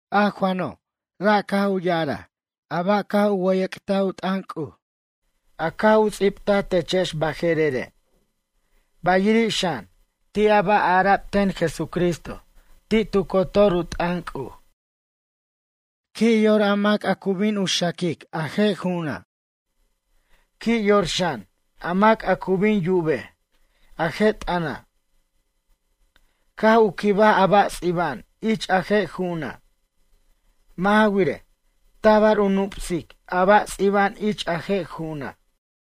A Juano', ra' caj u ya'araj a ba' caj u wʌyʌc't u t'ʌn C'uj, a caj u ts'ibtaj techex baje'rere', bayiri' xan, ti' a ba' ara'b ten Jesucristo ti' tu cotor u t'ʌn C'uj. Qui' yor a mac a cu bin xaquic a je' ju'una'. Qui' yor xan, a mac a cu bin yubej a je' t'ʌna', caj u quibaj a ba' ts'iba'an ich a je' ju'una'. Mʌ' ja wirej, tabar u nup'sic a ba' ts'iba'an ich a je' ju'una'.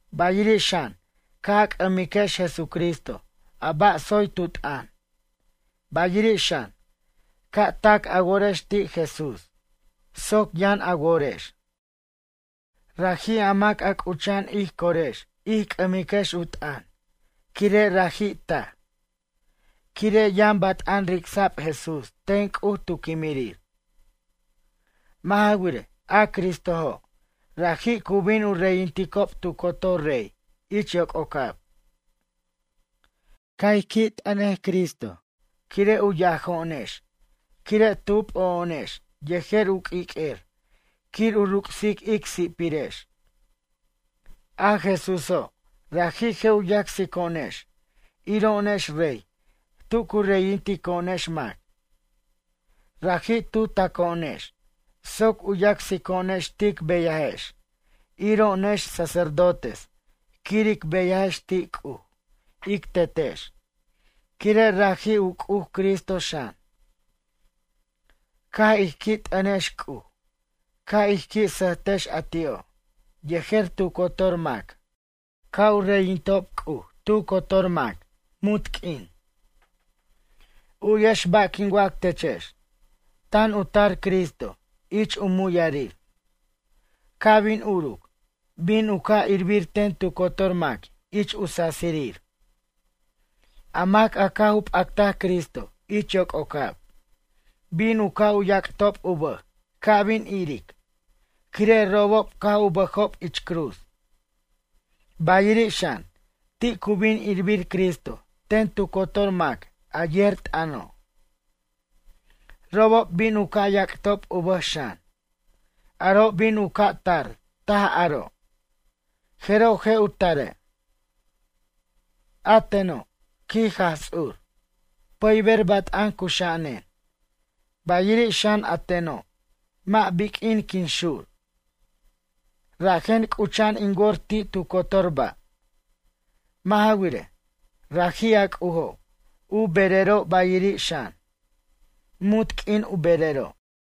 Bayiri' xan ca' a c'ʌmiquex Jesucristo a ba' tsoy tu t'ʌn, bayiri' xan, ca' tac a worex ti' Jesús soc yʌn a worex. Raji' a mac a c'ucha'an ij corex ij c'ʌmiquex u t'ʌn quire' raji' taj. Quire' yʌn bat'an ric'sa'b Jesús ten C'uj tu quimirir. Mʌ' ja wirej, a Cristojo', raji' cu bin u reyinticob tu cotor rey ich yoc'ocab. Ca' ij qui' t'ʌnej Cristo quire' u yajo'onex quire' tu p'o'o'onex yejer u q'uiq'uer quir u ruc'sic ic si'pirex. A Jesúso', raji' je' u yacsico'onex iro'onex rey tu cu reyintico'onex mac. Raji' tu taco'onex soc u yacsico'onex tic beyajex iro'onex sacerdotes quir ic beyajex ti' C'uj ic Tetex, quire' raji' u C'uj Cristo xan. Ca' ij qui' t'ʌntex C'uj, ca' ij qui' sʌjtex a ti'o', yejer tu cotor mac, ca' u reyinto' C'uj tu cotor mac, munt q'uin. U'yex ba' quin wac techex. Tan u tar Cristo ich u muyʌrir. Ca' bin uruc, bin u ca' irbir ten tu cotor mac ich u sasirir. A mac a caj u p'actaj Cristo ich yoc'ocab, bin u ca' u yac'tob u bʌj ca' bin iric, quire' robob caj u bʌjob ich cruz. Bayiri' xan, ti' cu bin irbir Cristo ten tu cotor mac a yer t'ʌno'. Robob bin u ca' yac'tob u bʌj xan. Aro' bin u ca' tar taj aro', jeroj je' u tare'. “A teno', quij Jaj Ts'ur, pʌyber bat'an cuxa'anen, bayiri' xan a teno' mʌ' biq'uin quin xur. Rajen c'ucha'an in wor ti' tu cotor ba'.” Mʌ' ja wirej, raji' a C'ujo' u berero' bayiri' xan, munt q'uin u berero'.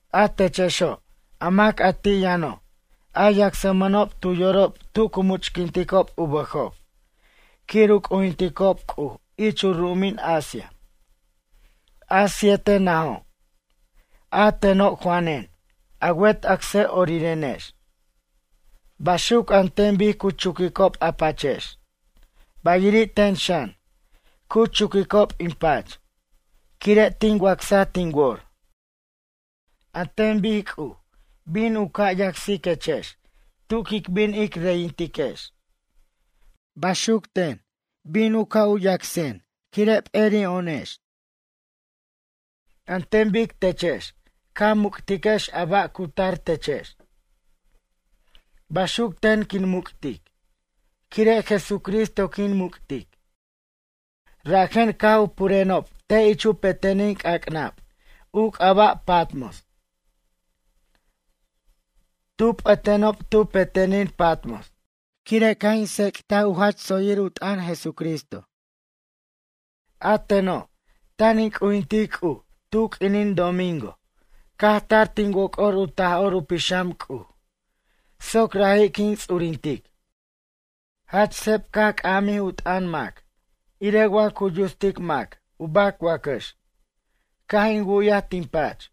A techexo', a mac a ti' yʌno', a yacsmʌnob tu yorob tu cu much'quinticob u bʌjob quir u c'ujinticob C'uj ich u ru'umin Asia, a sietej najo'. A teno' Juanen, a wet acsʌ'orirenex. Baxuc an ten bic cu chuquicob a pachex, bayiri' ten xan, cu chuquicob in pach, quire' tin wacsaj tin wor. An ten bic C'uj bin u ca' yacsiquechex tu quic bin ic reyintiquex, baxuc ten, bin u ca' u yacsen quire' p'eri'o'onex. An ten bic techex ca muc'tiquex a ba' cu tar techex, baxuc ten quin muc'tic, quire' Jesucristo quin muc'tic. Rajen caj u purenob te' ich u pe'tenin c'ac'nab u c'aba' Patmos. Tu p'atenob tu pe'tenin Patmos, quire' caj in tsec't u jach tsoyir u t'ʌn Jesucristo. A teno', tan in c'ujintic C'uj tu q'uinin domingo caj tar tin woc'or u Taj'or u Pixam C'uj, soc raji' quin ts'urintic. Jach seb caj c'amjij u t'ʌn mac irej wa cu yutstic mac u bac wacʌx, caj in wu'yaj tin pach.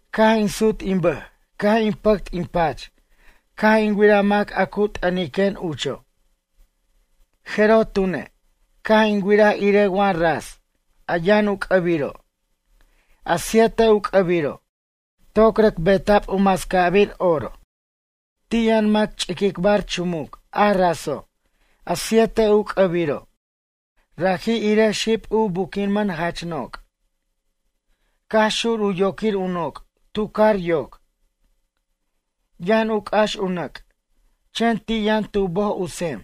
Caj in sut in bʌj caj in pʌct in pach caj in wiraj mac a cu t'ʌniquen ucho'. Jeroj tune', caj in wiraj irej wa ras, a yʌn u c'ʌbiro', a siete u c'ʌbiro', toc rʌc beta'b u mascabir oro. Ti' yʌn mac ch'iquicbar chumuc a raso', a sietej u c'ʌbiro', raji' irej xib u buquiman jach noc'. Caj xur u yoquir u noc' tu car yoc. Yʌn u c'ax u nʌc', chen ti' yʌn tu boj u sem.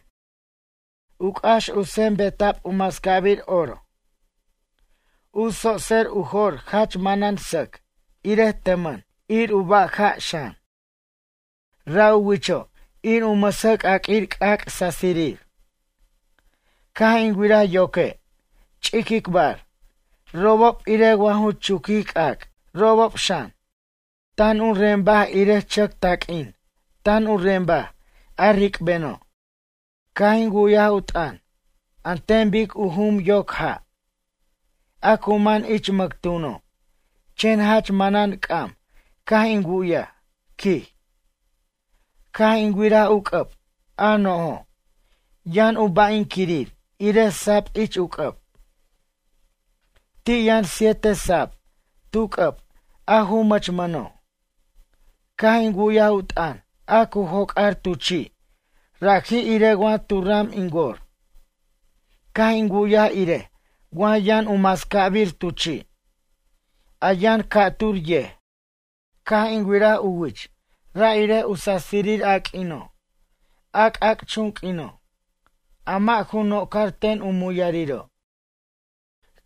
U c'ax u sem beta'b u mascabir oro. U tsotser u jo'r jach manan sʌc irej tʌmʌn, ir u baja' xan. Ra' u wicho' ir u mʌsʌc'aq'uir c'ac' sasirir. Caj in wiraj yoque', ch'iquicbar, robob irej wa ju chuquij c'ac', robob xan, tan u rembaj irej chʌc taq'uin tan u rembaj, a ric'beno'. Caj in wu'yaj u t'ʌn, an ten bic u jum yoc ja', a cu man ich mʌctuno', chen jach manan c'am caj in wu'yaj, quij. Caj in wiraj u c'ʌb, a nojo', yʌn u ba'inquirir irej sab ich u c'ʌb. Ti' yʌn siete sab tu c'ʌb a ju mʌchmʌno'. Caj in wu'yaj u t'ʌn a cu joc'ar tu chi', raji' irej wa tu ram in wor, caj in wu'yaj irej wa yʌn u mascabir tu chi', a yʌn ca'tur yej. Caj in wiraj u wich ra' irej u sasirir a q'uino', a c'ac'chun q'uino', a mʌ' ju nocar ten u muyariro'.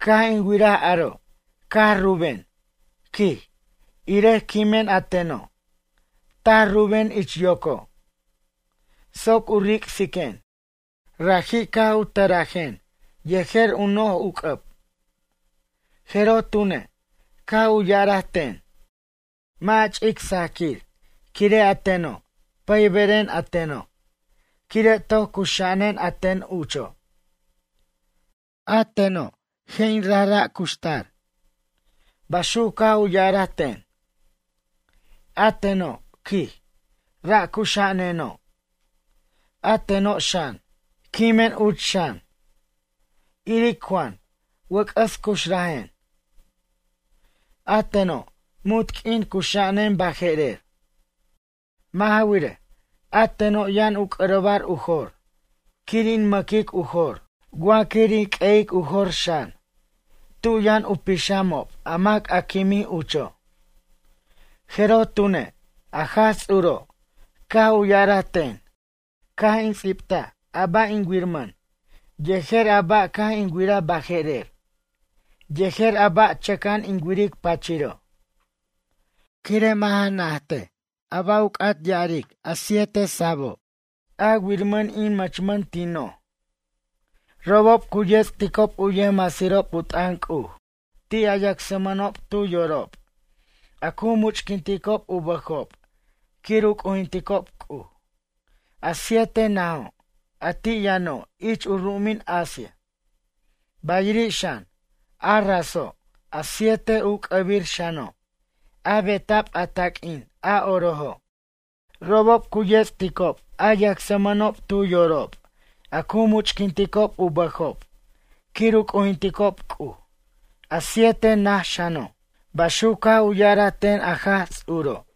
Caj in wiraj aro', caj rubuquen, quij, irej quimen a teno', taj ruben ich yoco'. Soc u ric'siquen, raji' caj u tʌrajen yejer u noj u c'ʌb. Jeroj tune', caj u ya'araj ten: ―Mʌ' a ch'ic sajquir quire' a teno', pʌyberen a teno' quire' toc cuxa'anen a ten ucho'. A teno' je' in rajra' cuxtar. Baxuc caj u ya'araj ten. A teno', quij, ra' cuxa'aneno', a teno' xan, quimen uch xan. Iric Juan, wʌc'ʌs cuxrajen. A teno', munt q'uin cuxa'anen baje'rer. Mʌ' ja wirej, a teno' yʌn u c'ʌrʌbar u jor quir in mʌquic u jor, wa quir in q'ueyic u jor xan, tu yʌn u pixamob a mac a quimij ucho'. Jeroj tune', a Jaj Ts'uro' caj u ya'araj ten, caj in ts'ibta a ba' in wiramʌn, yejer a ba' caj in wira baje'rer, yejer a ba' chʌca'an in wiric pachiro'. Quire' mʌ' ja najt a ba' u c'at ya'aric a siete sabo', a wirmʌn in mʌchmʌn tin noj. Robob cu yets'ticob u yʌjmasirob u t'ʌn C'uj ti' a yacsmʌnob tu yorob a cu much'quinticob u bʌjob quir u c'ujinticob C'uj, a sietej najo' a ti' yʌno' ich u ru'umin Asia. Bayiri' xan, a raso' a sietej u c'ʌbir xano', a beta'b a taq'uin a orojo', robob cu yets'ticob a yacsmʌnob tu yorob a cu much'quinticob u bʌjob quir u c'ujinticob C'uj, a sietej naj xano'. Baxuc caj u ya'araj ten a Jaj Ts'uro'.